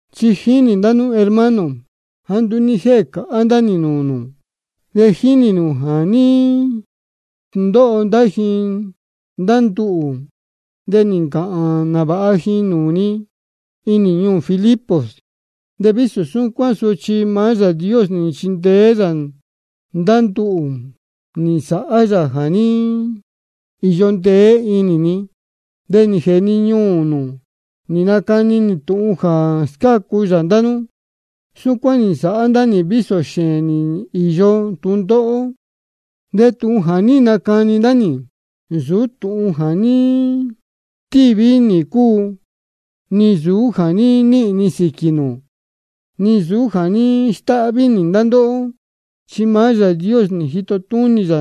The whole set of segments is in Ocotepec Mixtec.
Chi jínī ndá nú hermano, jāá nduú ní jéē cāhá ndá nī nūū nū. De jínī nū jā ní sndóho ndá ji ndá nduhū, de nī ncāhān nāvāha ji nūū ni inī ñuū Filipos. De vísō súcuán sochi maá Yāā Dios nī nchindeé yā ndá nduhū, nī nsāhá yā jā ní īyo ndeé inī ni, de nī jēē ni ñuū nū nī nacani nī tūhun jā scácu yā ndá nú. Súcuán nī nsāhá ndá nī vísō xēēn nī īyo tūndóhó. De tūhun jā ní nacani ndá nī, nsūú tūhun jā ní stíví nī cúu, ni nsūú jā níhīn ni sīquī nū, ni nsūú jā ní stáhví nī ndá ndóhó. Chi maá Yāā Dios nī jito túnī yā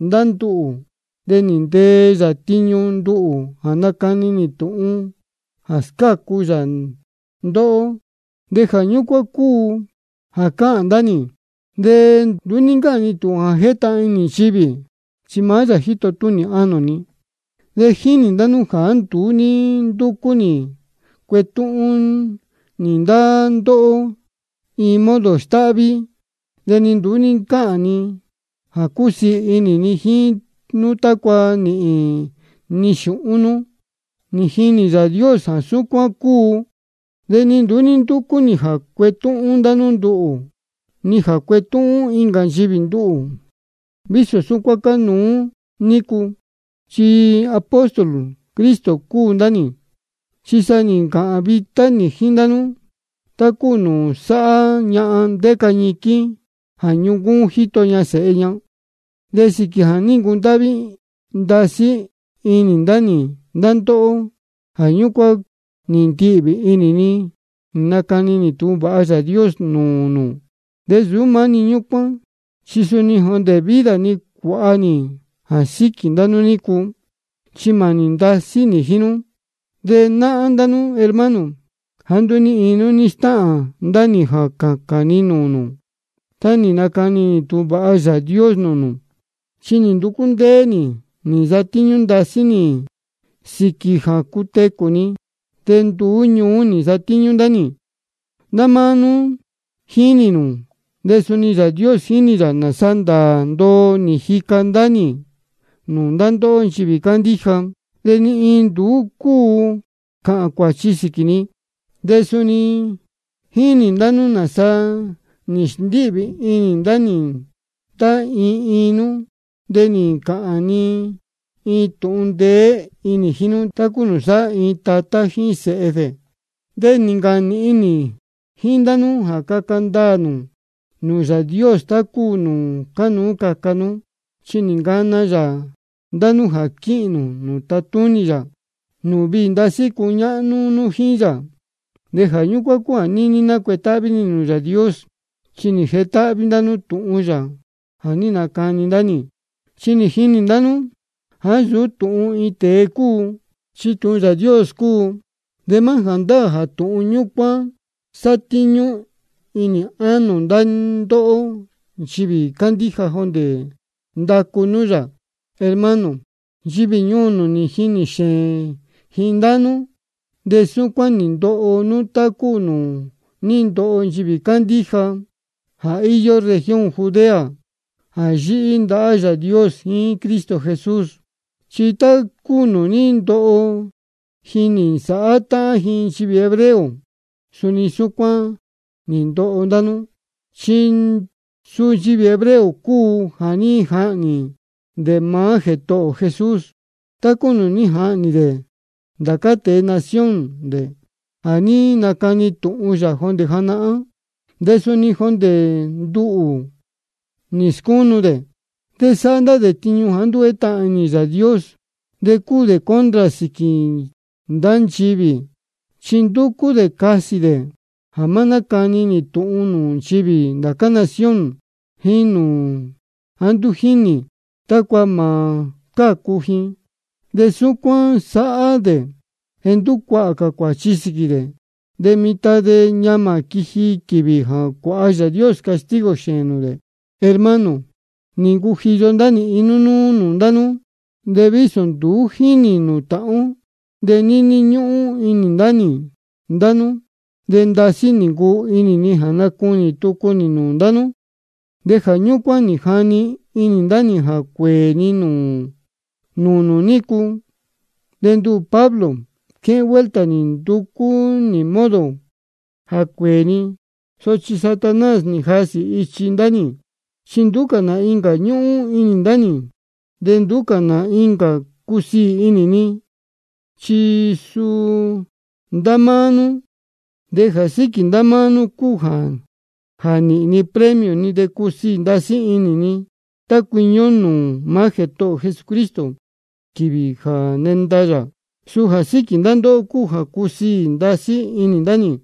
ndá nduhū, de nī ntee yā tiñu nduhū jā nacani nī tūhun jā scácu yā ndóhó. De jā ñúcuán cúu jā cáhān ndá nī. De nduú cáhān ni tūhun jā jétahān inī nchivī, chi sa jā jétahān inī Yāā Dios, chi maá yā jíto túnī ánō ni. De jínī ndá nú jāá nduú ní ndúcú nī cuetúhún nī ndá ndóhó iin modo stáhví, de ni nduú ní ncáhān ni jā cúsiī inī ni jíín nú tácua nīhīn ni xūhún nūū nū. De jínī Yāā Dios jā súcuán cúu. De ni nduú ní ndúcú nī jā cuetúhún ndá nú nduhū, ni jā cuetúhún incā nchivī nduhū, vísō súcuán cánuú nícu, chi apóstol Cristo cúu ndá nī. Chi sa nī ncāhān vitá nī jíín ndá nú, tá cúu nūū sáhá ñahan ndéca ñiquín jā ñuncúún jíto ña sēhe ña. De sīquī jā ní ncundáhví ndasí inī ndá nī ndá ndóhó, jā ñúcuán nī ndihvī inī ni nacani nī tūhun vāha Yāā Dios nūū nū. De nsūú maá-ni ñúcuán, chi suni jondē vida ni cuāha nī jā síquī ndá nú nícu, chi mānī ndasí nī jíín nú. De náhán ndá nú hermano, jāá nduú ni iin nú ní stáhān ndá nī jā cācān ni nūū nū tá nī nacani nī tūhun vāha Yāā Dios nūū nū. Chi nī nducú ndéé nī nī nsatíñú ndasí nī sīquī jā cutecū ni. De nduú ñuú nī nsatíñú ndá nī. Ndá máá nú jínī nū, de suni Yāā Dios jínī yā nāsa ndāā ndoo nī jica ndá nī nūū ndá ndóhó nchivī cándíja. De ni iin nduú cúu cāhān cuāchi sīquī ni. De suni jínī ndá nú nāsa nī sndíhvī inī ndá nī tá iin iin nú, de nī ncāhān ni tūhun ndeé inī jíín nú, tá cúu nūū sáhá iin tatá jíín sēhe dē. De nī ncāhān nīhin nī jíín ndá nú jā caca ndaā nū nūū Yāā Dios tá cúu nūū cánuú caca nú. Chi nī ncana yā ndá nú jā quíhīn nū nūū tátúnī yā, nūū viī cuñáhnú nú jíín yā. De jā ñúcuán cúu jā níní nácuetáhví nī nūū Yāā Dios, chi nī jetáhví ndá nú tūhun yā jā ní nacani ndá nī. Chi nī jinī ndá nú jāá nsūú tūhun iin tēe cúu, chi tūhun Yāā Dios cúu. De maá jāndáā jā tūhun ñúcuán sátíñú inī ánō ndá ndóhó nchivī cándíja jondē ndacu nú yā. Hermano, nchivī ñuū nū nī jinī xēēn ji ndá nú, de súcuán nī ndoho nú tá cúu nūū ní ndoho nchivī cándíja jā íyó región Judea jā yíhí ndahá Yāā Dios jíín Cristo Jesús. Chi tá cúu nūū ní ndoho ji nī nsāhá táhán ji nchivī hebreo, suni súcuán nī ndoho ndá nú. Chi suu nchivī hebreo cúu jā ní jahnī dē maá Jētohō ō Jesús, tá cúu nūū ní jahnī dē ndācá tēe nación dē jā ní nacani tūhun yā jondē janahán. De suni jondē ndá nduhū nī scúnu dē. De sáhá ndá dē tiñu jāá nduú jétahān inī Yāā Dios, de cúu dē contra sīquī ndá nchivī. Chi ndúcú dē casī dē jā má nácani nī tūhun nūū nchivī ndācá nación jāá nduú jínī, tácua mā cácu ji. De súcuán sáhá dē jā nducuahā cā cuāchi sīquī dē. De mitan de ñamā quiji quīvī jā cuāha Yāā Dios castigo xēēn nūū dē. Hermano, nī ncujiyo ndá nī iin núnúú-ni nūū ndá nú. De vísō nduú jínī ō nūū táhán ó, de níní ñúhún inī ndá nī ndá nú. De ndasí nī ncuu inī ni jā nacunī tucu nī nūū ndá nú. De jā ñúcuán nī jani inī ndá nī jā cuēē ni nūū nū nícu. De nduhū Pablo, quéhén vuelta nī nducú nī modo jā cuéē ni, sochi Satanás nī jasī ichi ndá nī. Chi nduú cā nā incā ñúhún inī ndá nī, de nduú cā nā incā cúsiī inī ni, chi suu ndá máá nú. De jā síquī ndá máá nú cúu jā nīhīn ni premio ni de cusiī ndasí inī ni tá cuiñi ó nūū maá Jētohō ō Jesucristo quīvī jā nenda yā. Suu jā síquī ndá ndóhó cúu jā cúsiī ndasí inī ndá nī.